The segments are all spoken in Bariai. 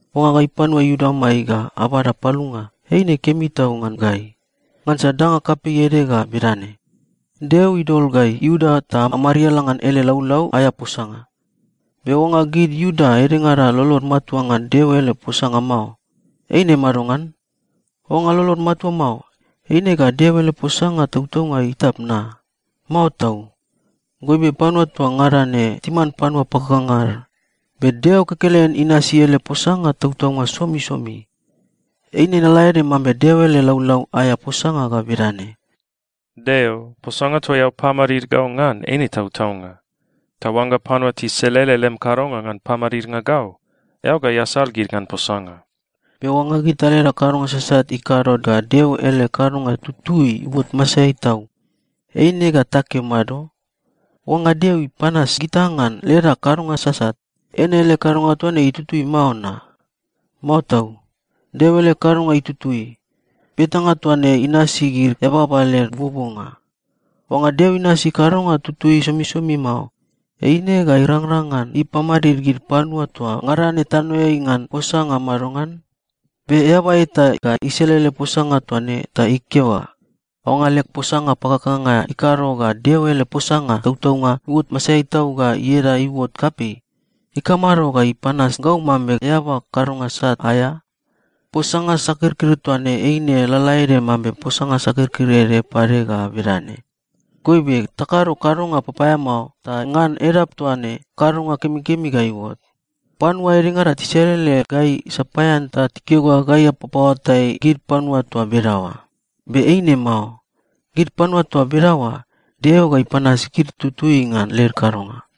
Oangga gai panua Iuda amai ga abada palunga, eine kemi tau ngan gai! Ngansa danga kapei ede ga bedane: Deo idol gai Iuda ta amariala ngan ele laulau aea posanga. Be oangga gid Iuda edengada lolod matua ngan Deo ele posanga mao, eine madongan? Oangga lolod matua mao, eine ga Deo ele posanga tautaunga itap na? Mao tau! Goibe panua toa ngada ne timan panua pakakanga ad, be Deo kekelen inasi ele posanga tautaunga somisomi. Eine lalaede mambe Deo ele laulau aea posanga ga bedane, “Deo, posanga toa eao pamadid gau ngan eine tautaunga. Ta oangga panua tiselele lem kadonga ngan pamadidnga gau, eao ga easal gid ngan posanga.” Be oangga gita leda kadonga sasat ikado ga Deo ele kadonga tutui iuot masaeai tau, eine ga takeo mado? Oangga Deo ipanas gita ngan leda kadonga sasat, eine ele kadonga toa ne itutui mao na? Mao tau! Deo ele kadonga itutui. (Betanga toa ne inasi gid eababa led buobuonga.) Oangga Deo inasi kadonga tutui somisomi mao, eine ga irangrang ngan ipamadid gid panua toa ngada ne tanoeai ngan posanga madongan? Be eaba eta ga iselele posanga toa ne ta ikeo ga, “Oangga leg posanga pakakanga ikado ga Deo ele posanga tautaunga iuot masaeai tau ga ieda iuot kapei, ikamado ga ipanas gau mambe eaba kadonga sat aea?” Posanga sakirkir toa ne eine lalaede mambe posanga sakirkir ede pade ga bedane, “Goibe, takado kadonga papaeamao, ta ngan edap toa ne, kadonga kemikemi ga iuot.” Panua edengada tiselele gai sapaean ta tikeo ga gai apapaoatai gid panua toa bedaoa. Be eine mao. Gid panua toa bedaoa, Deo ga ipanas gid tutui ngan led kadonga.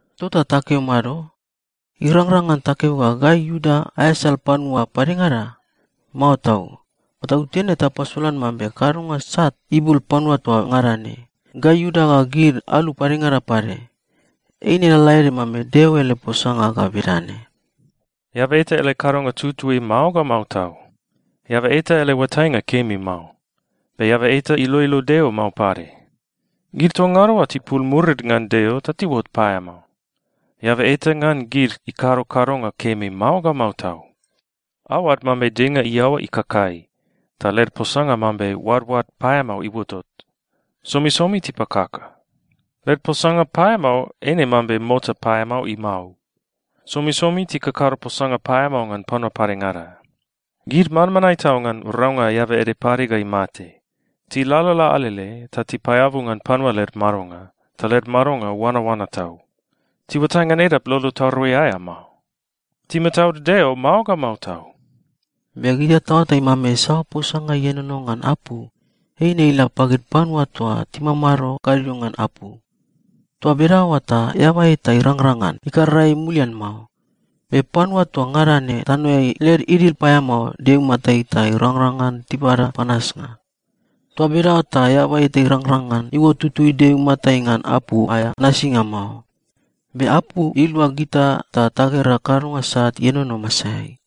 Tota takeo mado? Irangrang ngan takeo ga gai Iuda aeasal panua padengada? Mao tau! Patautene tapasolan mambe kadonga sat ibul panua toa ngada ne, gai Iuda ga gid alu padengada pade. Eine lalaede mambe Deo ele posanga ga bedane, “Eaba eta ele kadonga tutui mao ga mao tau. Eaba eta ele oatainga kemi mao. Be eaba eta iloilo Deo mao pade. Gid toa ngada oa tipul murid ngan Deo ta tiuot paeamao. Eaba eta ngan gid ikado kadonga kemi mao ga mao tau.” “Aoad mambe denga iaoa ikakai, ta led posanga mambe oadoad paeamao iuotot. Somisomi tipakaka.” “Led posanga paeamao eine mambe mota paeamao imau.” “Somisomi tikakado posanga paeamao ngan panua padengada.” “Gid manmanae tau ngan raunga eaba ede pade ga imate. Tilalala alele ta tipaeabu ngan panua led madonga, ta led madonga oanaoana tau. Tiuatai ngan edap lolo tarui aea mao.” “Timataud Deo mao ga mao tau.” Be gita taoatai mambe saoa posanga ienono ngan apu, eine ila pagid panua toa timamado gadio ngan apu. Toa bedaoa ta eaba eta irangrang ngan ikarara ei mulian mao. Be panua toa ngada ne tanoeai led idil paeamao Deo imatai ta irangrang ngan tibada panasnga. Toa bedaoa ta eaba eta irangrang ngan iuot tutui Deo imatai ngan apu aea nasinga mao. Be apu ilua gita ta tagera kadonga sat ienono masaeai.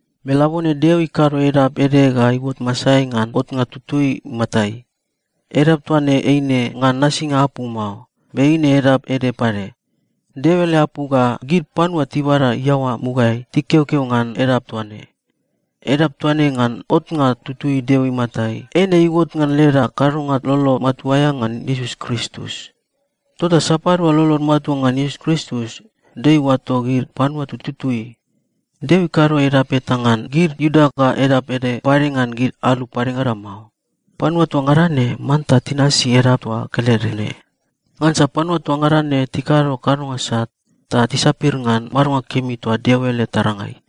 Be labone Deo ikado edap ede ga iuot masaeai ngan otnga tutui imatai. Edap toa ne eine ngan nasinga apu mao, be eine edap ede pade. Deo ele apu ga gid panua tibada iaoa mugaeai tikeokeo ngan edap toa ne. Edap toa ne ngan otnga tutui Deo imatai, eine iuot ngan leda kadonga lolo matua aea ngan Iesus Kristus. Tota sapadua lolod matua ngan Iesus Kristus, Deo iuato gid panua tututui. Deo ikado edap eta ngan gid Iuda ga edap ede pade ngan gid alu padengada mao. Panua toa ngada ne manta tinasi edap toa kelede ne. Ngansa panua toa ngada ne tikado kadonga sat, ta tisapir ngan madonga kemi toa Deo ele tarangai.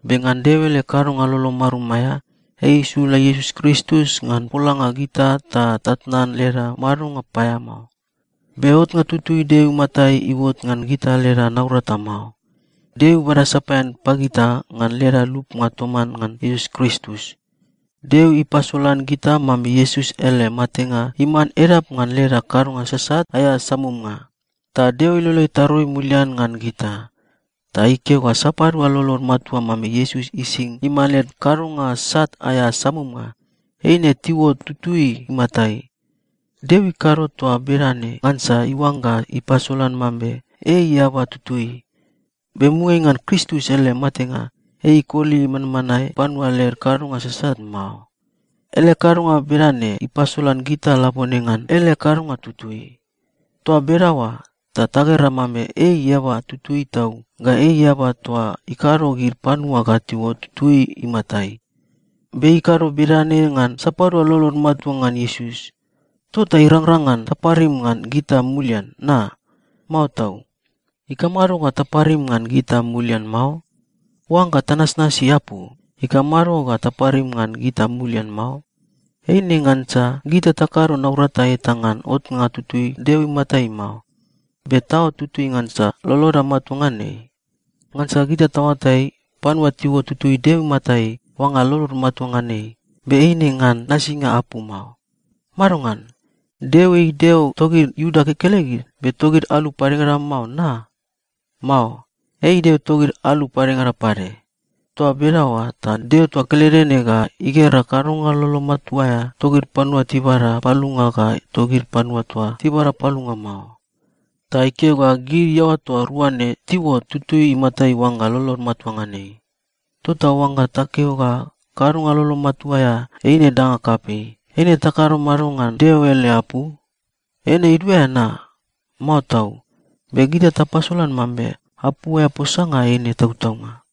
Be ngan Deo ele kadonga lolo marum aea, ei isula Iesus Kristus ngan polanga gita ta tatnan leda madonga paeamao. Be otnga tutui Deo imatai iuot ngan gita leda naurata mao. Deo ibada sapaean pagita ngan leda lupnga toman ngan Iesus Kristus. Deo ipasolan gita mambe Iesus ele matenga iman edap ngan leda kadonga sasat aea samumnga, ta Deo ilolo itarui mulian ngan gita. Ta ikeo ga sapadua lolod matua mambe Iesus ising iman led kadonga sat aea samumnga, eine tiuot tutui imatai. Deo ikado toa bedane ngansa iuangga ipasolan mambe ei eaba tutui, be mugaeai ngan Kristus ele matenga, ei ikoli manmanae panua led kadonga sasat mao. Ele kadonga bedane ipasolan gita labone ngan ele kadonga tutui. Toa bedaoa ta tagera mambe ei eaba tutui tau, ga ei eaba toa ikado gid panua ga tiuot tutui imatai. Be ei ikado bedane ngan sapadua lolod matua ngan Iesus. Tota irangrang ngan taparim ngan gita mulian na? Mao tau! Ikamado ga taparim ngan gita mulian mao? Oangga tanasnasi apu, ikamado ga taparim ngan gita mulian mao? Eine ngansa gita takado naurata eta ngan otnga tutui Deo imatai mao, be taot tutui ngansa loloda matua ngan ei. Ngansa gita taoatai, panua tiuot tutui Deo imatai oangga lolod matua ngan ei, be eine ngan nasinga apu mao. Madongan? Deo ei Deo togid Iuda kekelegid, be togid alu padengada mao, na? Mao. Ei Deo togid alu padengada pade. Toa bedaoa ta Deo toa kelede ne ga igera kadonga lolo matua aea togid panua tibada palunga ga togid panua toa tibada palunga mao, ta ikeo ga gid iaoa toa rua ne tiuot tutui imatai oangga lolod matua ngan ei. Tota oangga takeo ga kadonga lolo matua aea eine danga kapei, eine takado mado ngan Deo ele apu? Eine iduaea na? Mao tau! Be gita tapasolan mambe apu aea posanga eine tautaunga.